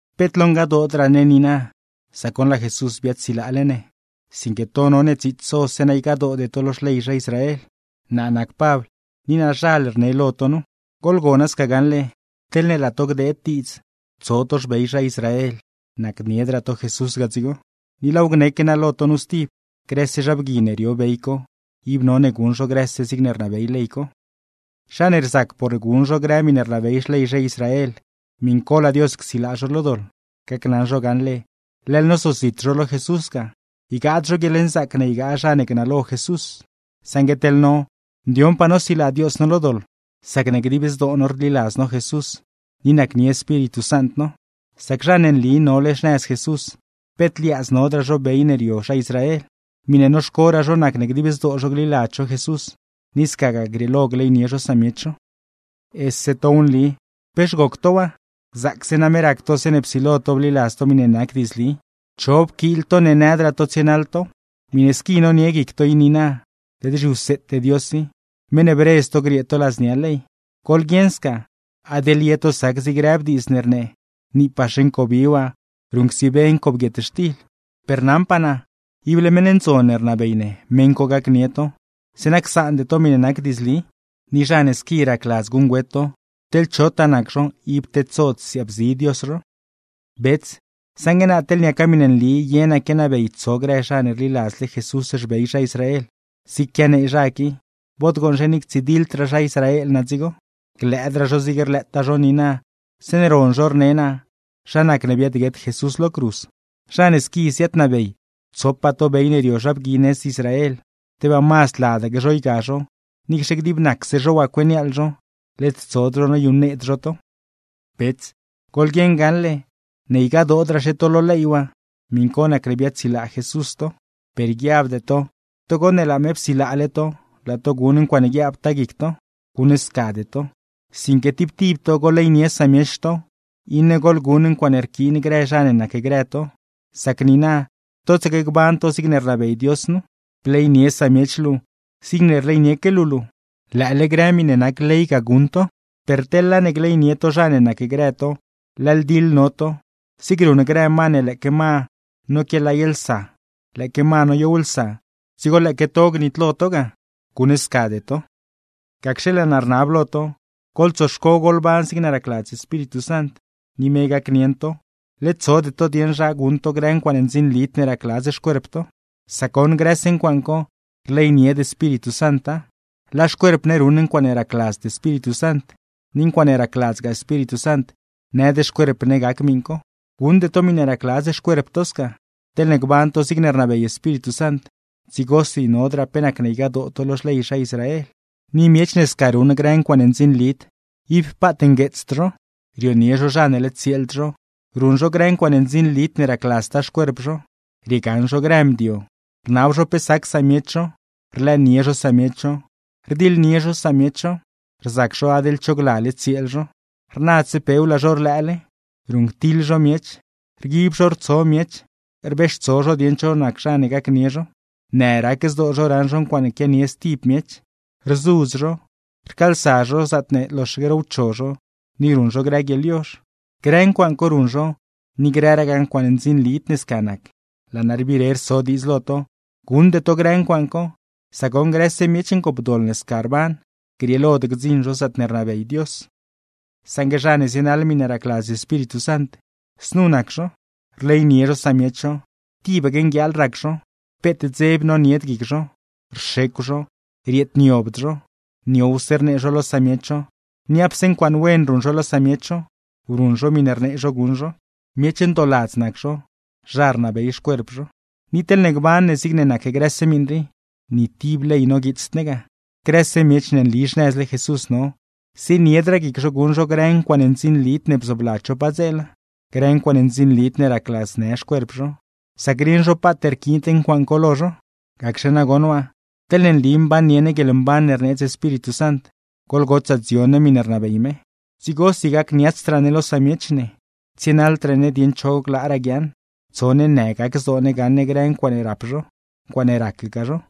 Peet lo ngadoodraa ne niina, sac goṉ laa Jesús biaadsilaale ne, sinque to none dziits so zeeṉa ygadoode to lo xley zha Israel. Naa nac Pabl, ni naazhal rne lo to nu. Goḻgona sca gaṉle, teḻne laa to gdeed diidz tso to xbey zha Israel, nacniedraa to Jesús ga dzigo. Ni laaw gneque naa lo to nu stib, grëse zha bgui ne rio bey co, ib none guṉ zho grëse zigne rnabey ley co. Zha ne rzac por guṉ zho grë miṉe rnabey xley zha Israel, miṉ co laa Dios csilaa zho lo doḻ, gacnaṉ zho gaṉle, leḻ nozozit zho lo Jesús ga; ygaad zho guieḻnzaac ne ygaa zha ne gnalo Jesús. Saṉgue teḻ no, ndioṉpaa no silaa Dios no lo doḻ, sacne dib zdoo no rliladz no Jesús ni nacnie Espíritu Sant no. Sac zha ne nli nole xnëz Jesús, peet liaadz nodraa zho bey ne rio zha Israel. Miṉe noxcoraa zho nac ne dib zdoo zho gliladz zho Jesús, ni scagaa grieelo gleynie zho samiech zho. ¡Ese tow nli! ¿Pex goc to waa? Zaacse name rac to zeeṉe psilo to bliladz to miṉe nac diidzli. ¿Cho pquiil to ne nëdraa to tsienaḻ tow? Miṉe squi nonie guic to i niina, led zhiwseete Dios i, meṉ ne bredz to griee to ladznia ley. Goḻguieṉ sca, adeḻ ye to sac zig rëb diidz ne rnee: “Niipaxe ncobi waa ruṉcsibe ncob guietxtil.” Per naṉpaa naa, ible meṉ ndzon ne rnabey ne meṉ co gacnie to, zeeṉa csaande to miṉe nac diidzli; ni zha ne squi racladz guṉgüet to, teḻ chotaa nac zho ib tedsod siaabzi Dios zho. Bets, saṉgue naa teḻ niaca miṉe nli ye naa quianabey tso grë zha ne rliladz Jesús xbey zha Israel zig quianee zha qui, bod gooṉzhe ni ctsidiḻdraa zha Israel naa dzigo, glëëdraa zho zig rlëëtaa zho niina zeeṉe ron zho rne naa zha nacne biaadguet Jesús lo cruz. Zha ne squi ziaadnabey tsopaa to bey ne rio zha bgui nëz Israel, ¡tebaa mazd ladaque zho yga zho, niicxe gdib nacse zho waa cueniaaḻ zho, led tsod zho noyuṉneed zho to! Bets, goḻguieṉ gaṉle ne ygadoodraaxe to lo ley waa, miṉ co nacne biaadsilaa Jesús to. Per guiabde to togo ne laa me psilaale to, laa to guṉ ncuaaṉe guiaabtaa guic to. Guṉscade to, sinque tib tib to goḻleynie samiech to, iṉe goḻguṉ ncuaaṉe rquiin grë zha ne nacgrë to; sac niina totsaque gban to zigne rnabey Dios nu: “Bleynie samiech luu zigne rleynieque luu luu”; lëële grë miṉe nac ley ga guṉ to. Per teḻ laa ne gleynie to zha ne nacgrë to, leḻ diḻ no to, zig ruṉ grë ma ne lëëque ma noquiaalaylsa, lëëque ma noyowlsa; dzigo lëëque to gnitlo to ga. ¡Guṉscade to! Gacxe, laa naa rnab lo to: Goḻtsoxco goḻban zigne racladz Espíritu Sant, ni me gacnieṉ to; led tsode to dieṉ zha guṉ to grë ncuaaṉe ndzinlid ne racladz xcuerp to. Sac goṉ grëse ncuaaṉ co, rleynied Espíritu Santa. Laa xcuerp ne ruṉ ncuaaṉe racladzd Espíritu Sant, ni ncuaaṉe racladzgaa Espíritu Sant nëd xcuerp ne gac miṉ co. Guṉde to miṉe racladz xcuerp to sca. Teḻne gban to zigne rnabey Espíritu Sant, dzigosi nodraa pe nacne ygadoo to lo xley zha Israel. Ni miech ne sca ruṉ grë ncuaaṉe ndzinlid, ib paat ngueetsd zho: rionie zho zha ne led tsieeld zho, ruṉ zho grë ncuaaṉe ndzinlid ne racladztaa xcuerp zho, riegaṉ zho grë mdio, rnab zho pe sac samiech zho, rlëënie zho samiech zho, rdiḻnie zho samiech zho, rzac zho adeḻ cho glale tsieel zho, rnadse pew laa zho rlëële, ruṉctiḻ zho miech, rguib zho rtso miech, rbeextso zho dieṉ cho zha ne gacnie zho, në rac zdoo zho raṉ zho ncuaaṉe quianie stib miech, rzudz zho, rcaalsa zho zaatne loxaque rowcho zho, ni ruṉ zho grë guieḻyozh. Grë ncuaaṉ co ruṉ zho ni grëragaa ncuaaṉe ndzinlid ne sca nac. Laa naa rbire rso diidz lo to, guṉde to grë ncuaaṉ co; sac goṉ grëse miech ngoopdoḻ ne sca rban, grieelod gdziṉ zho zaatne rnabey Dios. Saṉgue zha ne zienaḻ miṉe racladz Espíritu Sant, znu nac zha co: rleynie zho samiech zho, tibaque nguieeḻ rac zho, peet dzeb nonied guic zho, rxecw zho, rieedniobd zho, niowse rnee zho lo samiech zho, niapse ncuaaṉ wen ruṉ zho lo samiech zho, ruṉ zho miṉe rnee zho guṉ zho, miech ndooladz nac zho, zha rnabey xcuerp zho. Ni teḻne gban ne zigne nac grëse miṉ rii, ni tib ley noguiitsd ne ga. Grëse miech ne nli xnëzle Jesús no, zieniedraa guic zho guṉ zho grë ncuaaṉe ndzinlid ne bzoobladz zho padzeela, grë ncuaaṉe ndzinlid ne racladznë xcuerp zho, sac rieṉ zho paat rquiind ncuaaṉ co lo zho. Gacxe nagoṉ waa, teḻne nli mbannie ne guieḻmban ne rneedz Espíritu Sant, goḻgotsaa dzion ne miṉe rnabey me. Dzigosi gacniatsdraa ne lo samiech ne, tsienaḻdraa ne dieṉ cho glaaraa guiaaṉ, tso ne në gac zdoo ne gaṉ ne grë ncuaaṉe rap zho, ncuaaṉe racgaa zho.